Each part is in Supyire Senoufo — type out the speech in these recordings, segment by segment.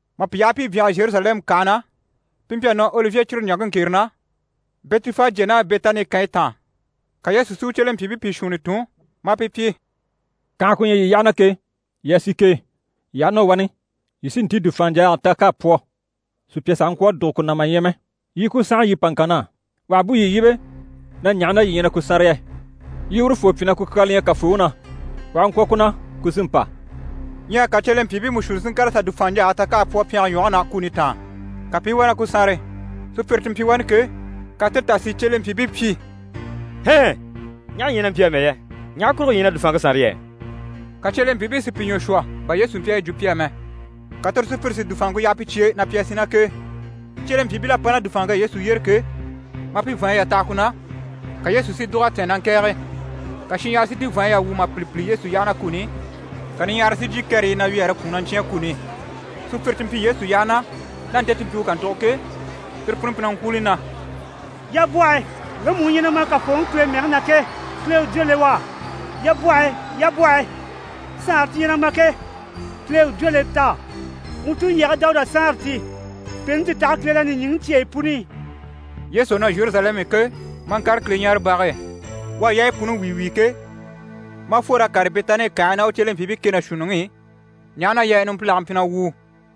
Mà pi yaha pi i byanhare Zheruzalɛmu kànhe na, pi mpyi a nɔ Olivye cire ɲaŋke ŋkere na, Bɛtifajye ná Bɛtani kànyi taan. Ka Yesu si u cyelempyiibii pìi shuunni tun, maa pi pyi: «Kànhe ku ɲyɛ yii yyaha na ke, yii a sì k'e. Yii aha nɔ wani, yii sí n‑tíi dùfaanɲjaaga ta k'à pwɔ, sùpya sàha ŋkwɔ̀ a dùgo ku na mà ɲya mɛ. Yii i ku sànha, yii pa ŋkan na á. Wà ha bú yii yíbe na “Ɲaha na yii ɲyɛ na ku sànre yɛ?” yii urufoo pyi na “Ku kyaa li ɲyɛ Kafooŋi na. U aha ŋkwɔ̀ ku na, ku sí n‑pa.”» Ɲyɛ ka cyelempyiibii mú shuunni si ŋkàr'a sà dùfaanɲjaage ta k'à pwɔ pyɛnge ɲwɔge na, kuni taan. Ka pi i wá na ku sànre. Sùpyire ti mpyi wani ke, ka tire tà si cyelempyiibii pyi: «Hɛn! Ɲaha yii na mpyi amɛ yɛ? Ɲaha kurugo yii ɲyɛ na dùfaanŋke sànre yɛ?» Ka cyelempyiibii si pi ɲwɔ shwɔ bà Yesu mpyi a yi jwo pi á mɛ. Ka tire sùpyire si dùfaanŋke yaha pi cye e na pi a sì ná k'e. Cyelempyiibil'à pa ná dùfaanŋke e Yesu yyére ke, maa pi vàanɲyi yà taha ku na, ka Yesu si dùg'a tɛ̀ɛn na ŋkɛ̀ɛge. Ka shinɲyahara si ti vàanntinɲyi yà wwû mà pìli pìli Yesu yyaha na kuni i, ka niɲyahara si jyè kɛrɛyi i na wyɛɛre kwùun na ɲcyáan kuni i. Sùpyire ti mpyi Yesu yyaha na, ná nte ti mpyi u kàntugo ke, tire puni mpyi na ŋkwúuli na: «Yabwɔhe! Ŋgemu u ɲyɛ na ma Kafooŋi Kile mɛge na ke, Kile u jwó le u á! Yabwɔhe! Yabwɔhe! Saanre ti ɲyɛ na ma ke, Kile u jwó le t'á. Wuu tulyage Dawuda Saanre ti. Pèente ti taha Kile na nìɲyicyeyi puni i!» Yesu à nɔ Zheruzalɛmu i ke, maa ŋkàre Kileɲaarebage e. U à yaayi puni wíi wíi ke, maa fwor'a kàre Bɛtani kànhe e ná u cyelempyiibii kɛ ná shuunniŋi i, ɲaha na yɛ numpilage mpyi na wwùu.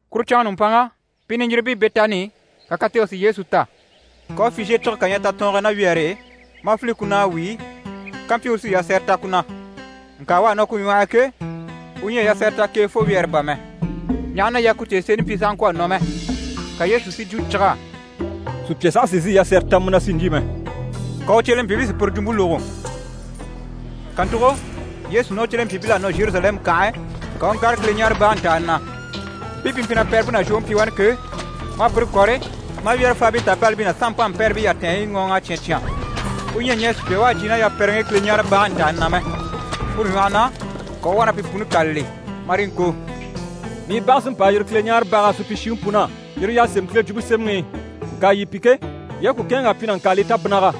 Kuru canŋa nùmpanŋa, pi niɲjiribii Bɛtani i, ka katege si Yesu ta. Ka u u fizhiye cige kà ɲya tatɔɔnge e ná wyɛɛre e, maa file ku na a wíi, kampyi u sí yasɛrɛ ta ku na. Ŋka u à nɔ ku ɲwɔh'i ke, u ɲyɛ a yasɛrɛ ta k'e fo wyɛɛre bà mɛ, ɲaha na yɛ ku tèeseni mpyi sàha ŋkwɔ̀ a nɔ mɛ. Ka Yesu si jwo cig'á: «Sùpya saha sì n‑sìi yasɛrɛ ta mu na, si ɲjyî mɛ.» Ka u cyelempyiibii si puru jwumpe lógo. Kàntugo, Yesu ná u cyelempyiibil'à nɔ Zheruzalɛmu kànhe e, ka u u ŋkàre Kileɲaarebage ntàani na. Mpii pi mpyi na pɛrɛmpe ná zhwoŋi pyi wani ke, maa pire kɔ̀re, maa wyɛ́rɛfaabii tàbalibii ná sanmpanmpɛrɛbii yatɛɛnɲyi ŋɔɔŋ'a cyán cyán. U ɲyɛ a ɲɛɛ sùpya u à jyè ná yapɛrɛŋi i Kileɲaarebage ntàani na mɛ. Puru ɲwɔhɔ na, ka u u wá na pi puni kâlali, marii ŋko: «“Mii bage sí n‑pa a yiri Kileɲaarebaga supyishiŋi pun'á.” Yire y'à sémɛ Kile Jwumpe Semɛŋi i. Ŋka yii pi ke, yii à ku kɛ̂ɛnŋ'a pyi “nàŋkaalii tabinniga”.»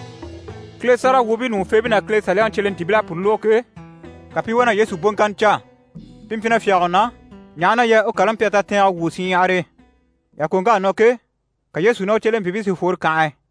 Kile sáragawwuubii ɲùŋufeebii ná Kile Saliyaŋi cyelentiibil'à puru lógo ke, ka pi i wá na Yesu boŋkanni caa. Pi mpyi na fyáge u na, ɲaha na yɛ u kàlaŋi mpyi a tatɛɛngɛ wwû shinɲyahar'e. Yàkoŋk'à nɔ ke, ka Yesu ná u cyelempyiibii si fworo kànhe e.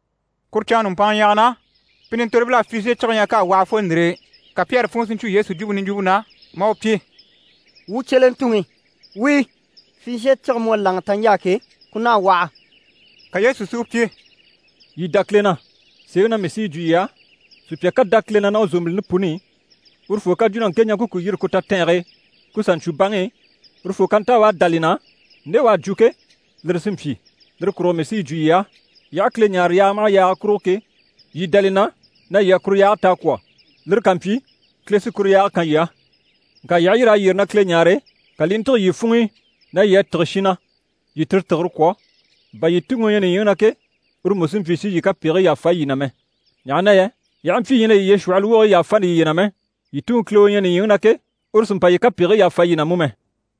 Kuru canŋke nùmpanŋa ɲyɛ̀ge na, pi nintorobil'à fizhiye cige ɲya k'à waha fo ndìre e. Ka Pyɛri funŋɔ si ɲcwo Yesu jwumpe niɲjwumpe na, maa u pyi: «Wuu cyelentuŋi, wíi, fizhiye cige mu à láŋa taɲjaa ke, ku naha a waha.» Ka Yesu si u pyi: «Yii dá Kile na. Sèeŋi na mii sí yi jwo yii á, sùpya ká dá Kile na ná u zòmbilini puni i, urufoo ká jwo na ŋke ɲaŋke ku yîri ku tatɛɛnge e, ku sà ɲcwo baŋi i, urufoo ká nta u à dá li na, nde u à jwo ke, lire sí n‑pyi. Lire kurugo mii sí yi jwo yii á, yii aha Kile ɲáare yaaga maha yaaga kurugo ke, yii dá li na na yii à kuru yaage ta a kwɔ̀, lire ká mpyi, Kile sí kuru yaage kan yii á. Ŋka yii aha yîr'a yyére na Kile ɲáare, ka li i ntîge yii funŋ'i na yii à tîge shin na, yii tire tìgire kwɔ̀, bà yii Tuŋi u ɲyɛ nìɲyiŋi na ke, uru mú sí n‑pyi si yii kapegigii yàfa yii na mɛ. [ Ɲaha na yɛ yii aha mpyi yii ɲyɛ na yiye shwɔ̀hɔlɔ wogigii yàfani yiye na mɛ, yii Tuŋi Kile u ɲyɛ nìɲyiŋi na ke, uru sì n‑pa yii kapegigii yàfa yii na mú mɛ.]»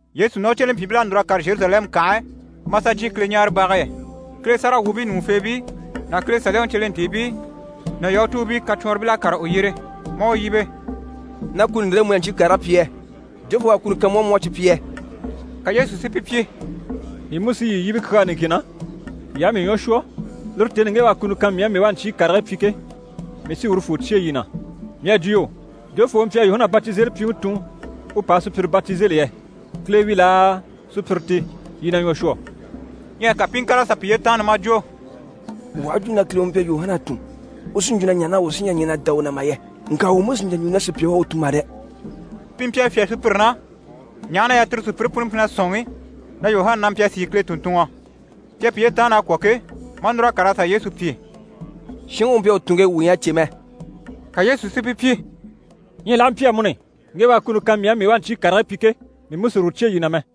Yesu ná u cyelempyiibil'à núr'a kàre Zheruzalɛmu kànhe e, maa sà jyè Kileɲaarebage e. Yesu niɲaraŋi ku funŋke e, Kile sáragawwuubii ɲùŋufeebii ná Kile Saliyaŋi cyelentiibii ná Yahutuubii kacwɔnribil'à kàre u yyére. Maa u yíbe: «Ná kuni ndire e mu na ɲcyii karigii pyi yɛ? Jofoo u à kuni kan mu á, mu u a cyi pyi yɛ?» Ka Yesu si pi pyi: «Mii mú sí yii yíbe kyaa niŋkin na, yii aha mii ɲwɔ shwɔ, lire tèni i ŋge u à kuni kan mii á mii u a ɲcyii karigii pyi ke, mii sí urufoo cyêe yii na. Mii à jwo yo, jofoo u mpyi a Yuhana Batizelipyiŋi tun u pa a sùpyire batizeli yɛ? Kile wi laa, sùpyire ti? Yii na ɲwɔ shwɔ!» Ɲyɛ ka pi i ŋkàr'a sà piye taanna maa jwo: «Wuu aha jwo na Kile u mpyi a Yuhana tun, u sí n‑jwo na ɲaha na wuu sí ɲyɛ a ɲɛn'a dá u na mà yɛ? Ŋka wuu mú sì n‑jà n‑jwo na sùpya u à u tun mà dɛ!» Pi mpyi a fyá sùpyire na, ɲaha na yɛ tire sùpyire puni mpyi na sɔ̂nŋi na Yuhana na mpyi a sìi Kile tùnntunŋɔ. Pi à piye taanna a kwɔ̀ ke, maa núr'a kàr'a sà Yesu pyi: «Shinŋi u mpyi a u tun ke, wuu ɲyɛ a cè mɛ.» Ka Yesu si pi pyi: «Ɲyɛ l'aha mpyi amuni, ŋge u à kuni kan mii á, mii u a ɲcyii karigii pyi ke, mii mú sì uru cyêe yii na mɛ.»